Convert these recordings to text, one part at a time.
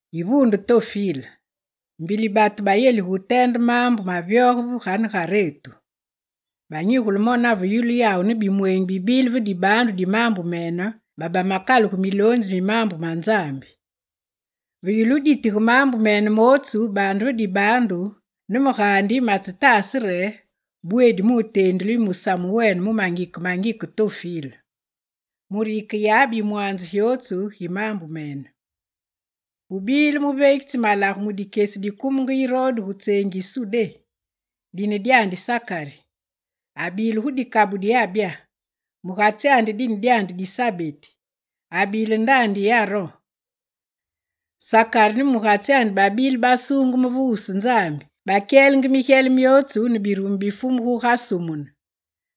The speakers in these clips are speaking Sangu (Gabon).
Yivuunde Tofile, mbili batu bayelige wuteende maambu mavyoge ve ganegaretu. Banyigule mo nave yulu yawu ne bimweenyi bibile ve dibaandu di maambu mene, babamakalugu miloonzi mi maambu ma Nzambi. Ve yulu wuditige maambu mene mootsu baande ve dibaandu, ne me gaandi matsetaase re bweedi muteendile yu musamu wene mu mangike mangike Tofile. Mure yikeyabe yimwanze gyotsu gi maambu mene. Gubile muveegitsi malagu mu dikyesi dikumenge Irode gu tseengi yi Sudé, dine dyandi Sakari, abile gu dikabu di Abya. Mugatsyandi dine dyandi Disabeti, abile ndaandi yi Aron. Sakari ne mugatsi babile basuungeme ve wusu Nzambi, bakyelenge migyele myootsu ne birumu bi Fumu guga sumune.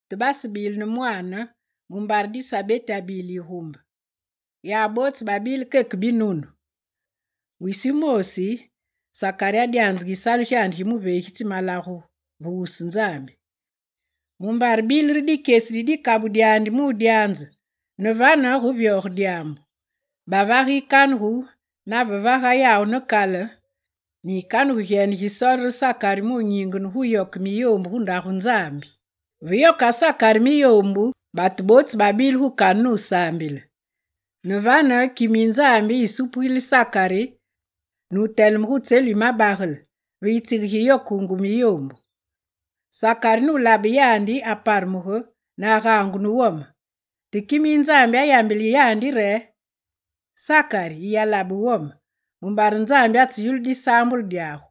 Te basebile ne mwaane, mumbare Disabeti abile yigumbe. Yawu bootsu babile keke binunu. Wisi wumoosi, Sakari adyanzenge yisalu gyandi gi muveegitsi malagu ve wusu Nzambi, mumbare bile re dikyesi di dikabu dyandi mudyanze, ne vane guvyoge dyaambu. Bavage yikanugu, navevaga yawu ne kale ne yikanugu gyene gisoole re Sakari mu wunyingene guyoke miyoombu gu Ndagu Nzambi. Ve yoka Sakari miyoombu batu bootsu babile gu kane nusaambile. Ne vane, kime yi Nzambi asupugile Sakari, nuteleme gu tselu yi mabagele, ve yitsige gi yokungu miyoombu. Sakari nulabe yandi, aparemugu, ne agaangu ne wome. Te kime yi Nzambi ayambile yandi re: «Sakari yiyalabe wome, mumbare Nzambi atseyulu disaambulu dyagu.»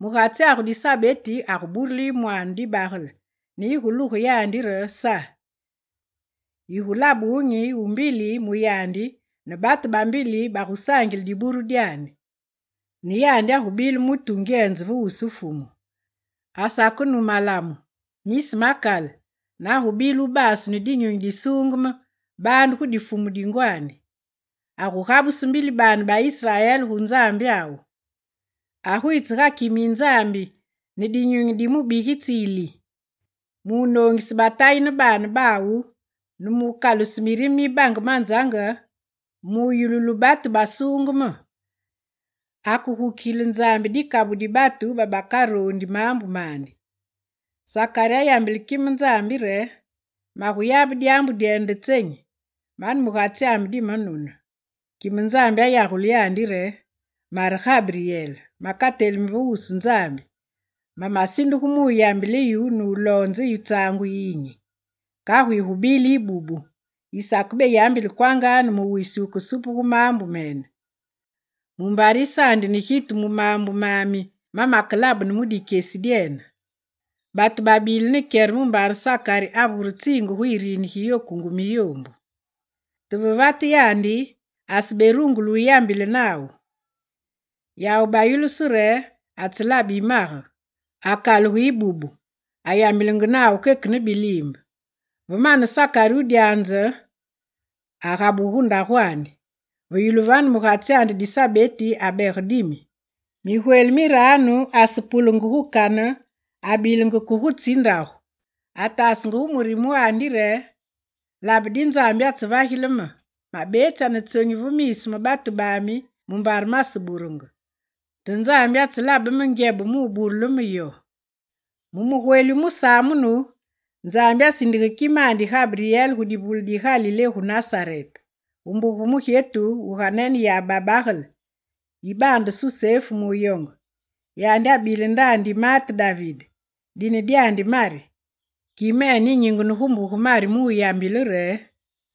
Mugatsyagu Disabeti aguburile yu mwaane dibagele, ne yiguluge yandi re: «Sa.» Yigulabe wunyi wu mbili mu yandi ne batu bambili bagusaangile diburu dyandi. Ne yandi agubile mutu wungyenze ve wusu Fumu. Asakenu malamu, nisi ma kale ne agubile wubasu ne Dinyunyi Disuungeme baande gu difumu di ngwandi. Agugabuse mbili baane ba Israel gu Nzambyawu. Agwitse ga kime yi Nzambi ne dinyunyi ne ngudi yi mubigitsi Ili, munoongise batayi ne baane bawu ne mukaluse mirime mi bange manzange, mu yululu batu basuungeme, akegukigile Nzambi dikabu di batu babakaroondi maambu mandi. Sakari ayambile kime Nzambi re: «Maguyabe dyaambu dyene nde tsenyi? Mane mugatsi dimanune.» Kime Nzambi ayagule yandi re: «Mare Gabryel, makatelimi ve wusu Nzambi, mamasindugu muyambile, nuloonze yu tsaangu yiyinyi. Kagu yigubile yibubu, yisakebeyambile kwanga ne mu wisi wukesupugu maambu mene. Mumbare yisane gitu mu maambu mami makelabene mu dikyesi dyene.» Batu babile ne kyere mumbare Sakari avure tsiinge gu yirini giyokungu miyoombu. Te ve vate yandi, aseberungule wuyambile nawu. Yawu bayulusu re atselabe yimage. Akalugu yibubu, ayambilenge nawu keke ne biliimbe. Ve mane Sakari wudyaanze, agabugu gu ndagwandi. Ve yulu vane mugatsyandi Disabeti abege dimi, migweli miranu asepulenge gu kane abilenge ke gutsi ndagu. Ataasenge gu murime wandi re: «Labe di Nzambi atsevagile me, mabetsya ne tsonyi ve miisu ma batu bami mumbare maseburenge, te Nzambi atselabe me ngyebe muburule me yo.» Mu mugweli wu musamunu, Nzambi asindige kimandi Gabryel gu divule di Galilé gu Nasarete. Gu nuumbe mugyetu yiganeneyabe babagale yibaande Susefu muyonge. Yandi abile ndaandi yi maate David, dine dyandi Mari. Kimene yinyingene gu mbuge Mari muyambile re: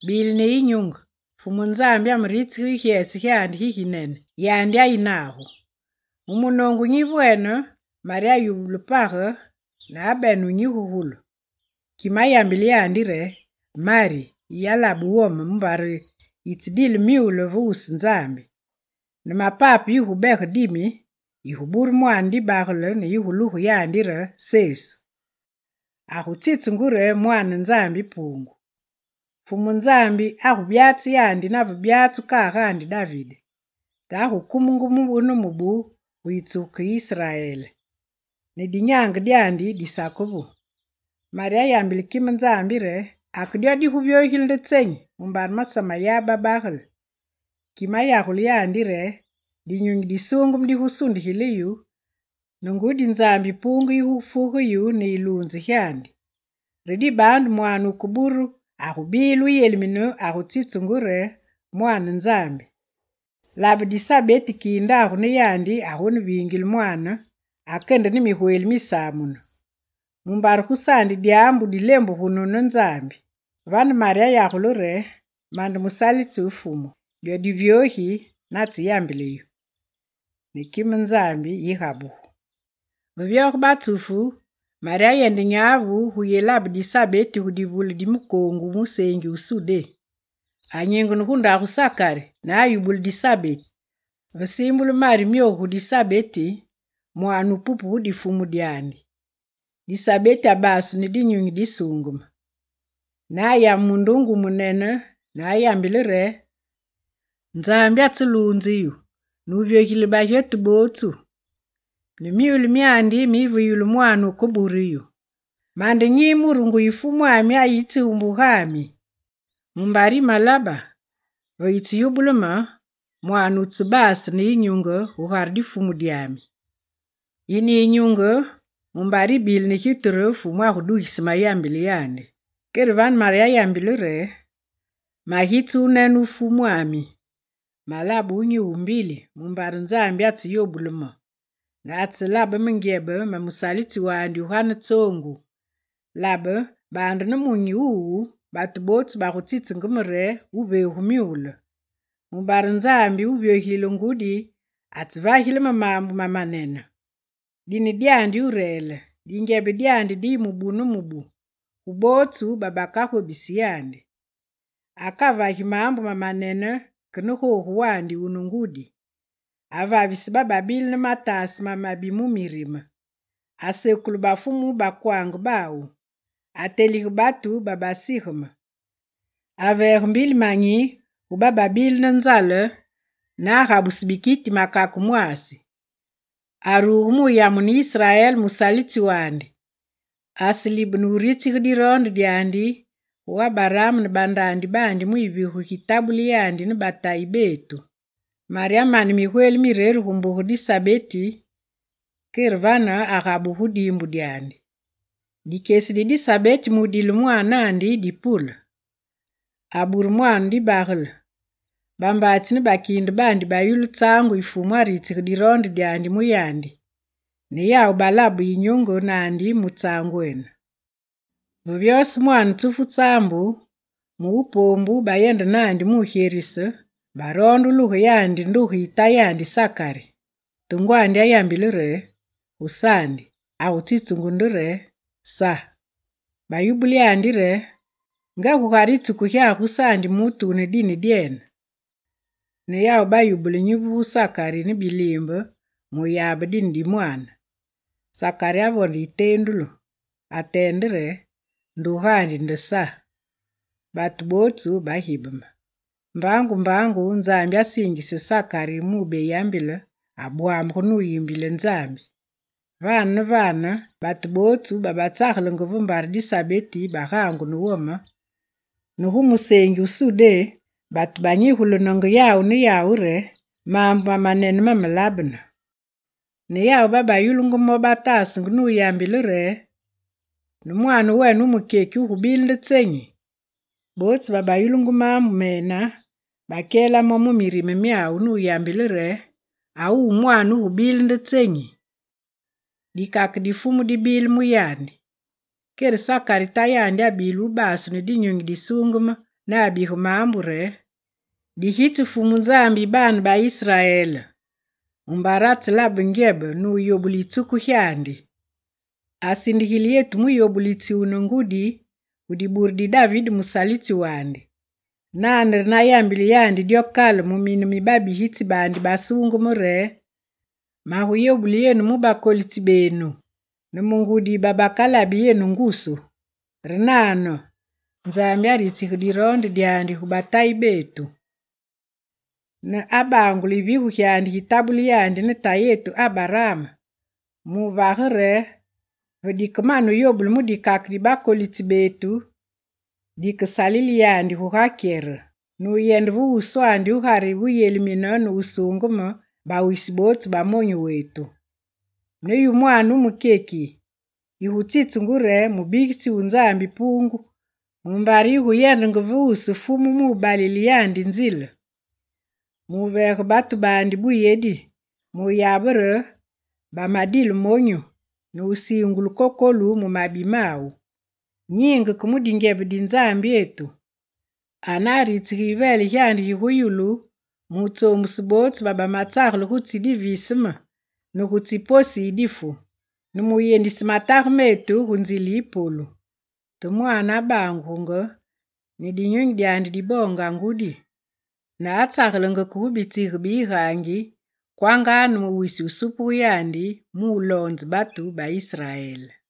«Bile ne yinyunge! Fumu Nzambi ameritsige yu gyese gyandi giginene, yandi ayi nagu.» Mu munoongu nyivwene, Mari ayulu page ne abene wunyigugulu. Kime ayambile yandi re: «Mari yiyalabe wome, mumbare yitsedile myule ve wusu Nzambi. Ne mapape yigubege dimi, yigubure mwaane dibagele ne yiguluge yandi re Sesu. Agutsitsungu re Mwaane Nzambi Puungu. Fumu Nzambi agubyatse yandi nave byatsu kagaandi David. Te agukume mubu ne mubu mu yitsuku gi Israel, ne dinyaange dyandi disakevu.» Mari ayambile kime Nzambi re: «Ake dyo diguvyogile nde tsenyi mumbare masameyabe babagele?» Kime ayagule yandi re: «Dinyunyi Disuungeme digusundigile yu, ne ngudi yi Nzambi Puungu yigufuge yu ne yiluunze gyandi, re dibaandu mwaane wukeburu agubile wuyelimine agutsitsungu re: Mwaane Nzambi. Labe, Disabeti kiindagu ne yandi agoneviinge mwaane, ake ne migweli misamunu. Mumbare gusaandi dyaambu dikelembugunu ne Nzambi.» Vane Mari ayagule re: «Mande musalitsi wu Fumu, dyo divyogi natseyambile yu.» Ne kime Nzambi yigabugu. Ve vyoge batsufu, Mari ayende nyavu guyelabe Disabeti gu divule di mukoongu wu museengi wu Sudé. Anyingene gu ndagu Sakari ne ayubule Disabeti. Ve siimbule Mari myogu gu Disabeti, mwaane wupupe gu difumu dyandi. Disabeti abasu ne Dinyunyi Disuungeme. Ne ayame mundunge wumunene ne ayambile re: «Nzambi atseluunze yu.» Nuvyogilile bagyetu bootsu ne myule myandi miyi ve yulu mwaane wukebure yu! Mande nyi mure nguyi Fumwami ayitsi gu mbugami? Mumbare yimelabe ve yitseyubule me, mwaane wutsebase ne yinyunge gugare difumu dyami. Yine yinyunge mumbare yibile ne gitu re Fumu agudugise mayambile yandi. Kere vane Mari ayambile re: «Magitse wunene wu Fumwami. Malabe wunyi wu mbili mumbare Nzambi atseyobule me. Ne atselabe me ngyebe, me musalitsi wandi wugane tsoongu, labe, baande nemunyi wuwu batu bootsu bagutsitsenge me re wuveegu myule. Mumbare Nzambi wuvyogilile ngudi atsevagile me maambu mamanene. Dine dyandi Wureele. Dingyebe dyandi diyi mubu ne mubu gu bootsu babakagobisi yandi. Akavagi maambu mamanene ke ne googu wandi wune ngudi. Avavise bababile ne mataase mamabi mu mirime. Asekule bafumu mu bakwange bawu, atelige batu babasigeme. Aveege mbili manyi gu bababile ne nzale, ne agabuse bikiti makake mwaasi. Aruge muyamune Israel, musalitsi wandi: Aselibene wuritsige diroonde dyandi, gu Abaraam ne bandaandi baandi mu yivigu gitabule yandi ne batayi betu.» Mari amane migweli mireru gu mbuge Disabeti, kere vane agabugu gu diimbu dyandi. Dikyesi di Disabeti mudile mwaanandi, dipule. Abure mwaane dibagele. Bambaatsi ne bakiinde baandi bayulu tsaangu yi Fumu aritsige diroonde dyandi mu yandi, ne yawu balabe yinyunge naandi mu tsaangwene. Ve vyose mwaane tsufu tsaambu, mu wu poombu, bayende naandi mugyerise, baroonde wuluge yandi nduge yi tayandi Sakari. Te ngwandi ayambile re: «Gusaandi, agutsitsungu nde re Sa.» Bayubule yandi re: «Nga gugare yitsuku gyagu gusaandi mutu wune dine dyene!» Ne yawu bayubule nyivu gu Sakari ne biliimbe muyabe dine di mwaane. Sakari avonde yiteendulu, ateende re: «Ndugandi nde Sa.» Batu bootsu bagibeme. Mbaangu mbaangu Nzambi asiingise Sakari mu beyambile, abwamugu nuyimbile Nzambi. Vane ne vane batu bootsu babatsagelenge ve mbare Disabeti bagaangu ne wome, ne gu museengi wu Sudé batu banyigulenenge yawu ne yawu re maambu mamanene mamalabene. Ne yawu babayulungu mo, bataasenge, nuyambile re: «Ne mwaane wene wu mukyeki, wugubile nde tsenyi?» Bootsu babayulungu maambu mene bakyela mo mu mirime myawu, nuyambile re: «A wuwu mwaane wugubile nde tsenyi?» Dikake di Fumu dibile mu yandi. Kere Sakari tayandi abile wubasu ne Dinyunyi Disuungeme ne abige maambu re: «Digitsi Fumu Nzambi yi baane ba Israel, mumbare atselabe ngyebe, nuyobule yitsuku gyandi. Asindigile yetu muyobulitsi wune ngudi gu dibure di David musalitsi wandi. Nane re na yambile yandi dyo kale mu mine mi babigitsi baandi basuungeme re: Maguyobule yenu mu bakolitsi benu, ne mu ngudi yi babakalabi yenu ngusu. Re nane, Nzambi aritsige diroonde dyandi gu batayi betu. Ne abangule yivigu gyandi gitabule yandi ne tayetu Abaraam, muvage re ve dikemane yobulu mu dikake di bakolitsi betu, dikesalile yandi guga kyere. Nuyende ve wuswandi gugare wuyelimine, ne wusuungeme bawisi bootsu ba monyu wetu. Ne yu mwaane wumukyeki, yigutsitsungu re mubigitsi wu Nzambi Puungu mumbare yiguyendenge va wusu Fumu mu balile yandi nzile. Muveege batu baandi buyedi muyabe re bamadile monyu, ne musiingulu kokolu mu mabi mawu. Nyiinge ke mu dingyebe di Nzambyetu. Anaritsige yiveele gyandi gigu yulu. Mutsoombuse bootsu babamatsagele gutsi diviseme, ne gutsi posi yi difu, ne wuyendise matage metu gu nzile yi polu.» Te mwaane abangugunge ne dinyunyi dyandi diboonga ngudi, ne atsagelenge ke gu bitsiige bi yigaangi kwanga ne mu wisi wu supugu yandi muloonze batu ba Israel.